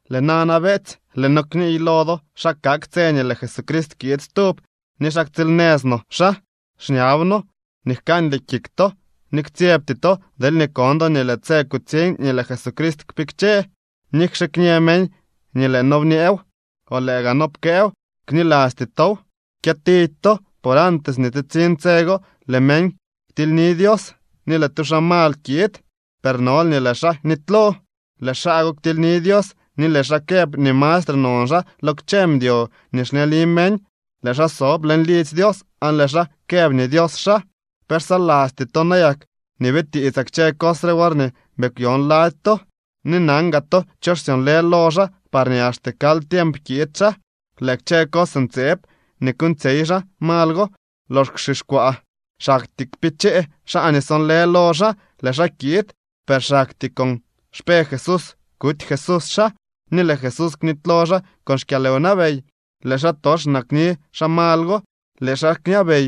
Lëë nana, beetsy, lëë noo kniiy lo do xa kak tse nii lëë Jesucrist kiid stub ni xa ktsiilnëz no xaa. Xñab noo nii jkandy kik to ni ktsyebty to deelñee kon do nii lëë tse kutsiñ nii lëë Jesucrist kpikche. Nikxe kñë meñ nii lëë noo bñeew o lëë gaa noo pkëëw, knilasty tow. Kyëtidy to, por antes nii tsitsiñ tse go, lëë meñ ktilyni Dios, ni lëë tu xaa mal kiid, per nol nii lëë xaa nitylo. Lëë xaa go ktilyni Dios ni lëë xaa këb nii mastre non xaa lo kchë mdyo nii xleni meñ. Lëë xaa sob leñ lidzy Dios aan lëë xaa këb nii Dios xaa. ¿Pe xsalasty to nayak nii bitiitsaa kchë cos re worñee bii kwyon lady to? Ni nan gaa to cho xsyonlë lo xaa parñee axte kal tiemp kiid xaa. Lëë kchë cos ntseeb nii kuuñtsyey xaa mal go lox kwxixkwaa, xaktyee kpichee xaa nii sonlë lo xaa. Lëë xaa kiid, per xaktyee con xpe Jesús kuty Jesús xaa, ni lëë Jesús knitylo xaa con xkyalwnabey. Lëë xaatox nakni xaa mal go. Lëë xaa kñabey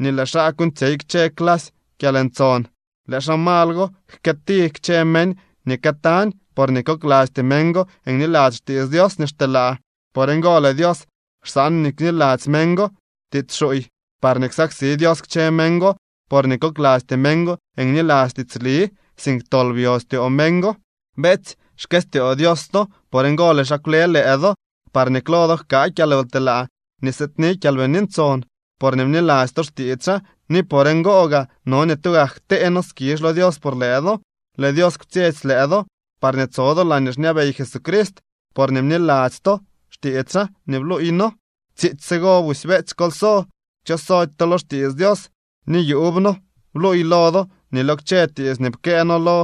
ni lëë xaa kuuñtsyey kchë clasy kyalntson. Lëë xaa mal go jkëëti kchë meñ nii këtañ, porñee koklasty meñ go niladzy xtiits Dios nii xteelaa. Por ngo lëë Dios xsaan nii kniladzy meñ go tiits xuuy parñee ksaksi Dios kchë meñ go, porñee koklasty meñ go niladzy tiitsli, sink tol byo styoo meñ go. Beetsy, xkëstyoo Dios to. Por ngo lëë xaa kwle lëë do parñee klo do jkaa kyalwtelaa nii sëëdni Kyalbini Ntson porñee bniladzy to xtiits xaa, ni por ngo gaa no nii tugak ktee noo skizh lo Dios por lëë do. Lëë Dios kwtsyetsy lëë do parñee tso do laañee xñabey Jesucrist porñee bniladzy to xtiits xaa nii bluuy noo. Tsiitsy tsigo busy, beetsy, kol so, kchosody to lo xtiits Dios nii yuub noo bluuy lo do ni lo kchë tiits nii pkëë noo lo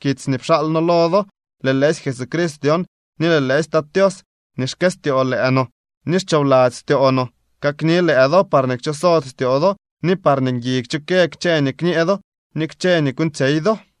kitsy nii pxaal noo lo do. Lëë lëësy Jesucrist dyon ni lëë lëësy Tat Tios nii xkëstyoo lëë no ni xchoobladzy styoo no kakni lëë do parñee kchosody styoo do ni parñee ngui kchukë kchë nii kñee do ni kchë nii kuuñtsyey do.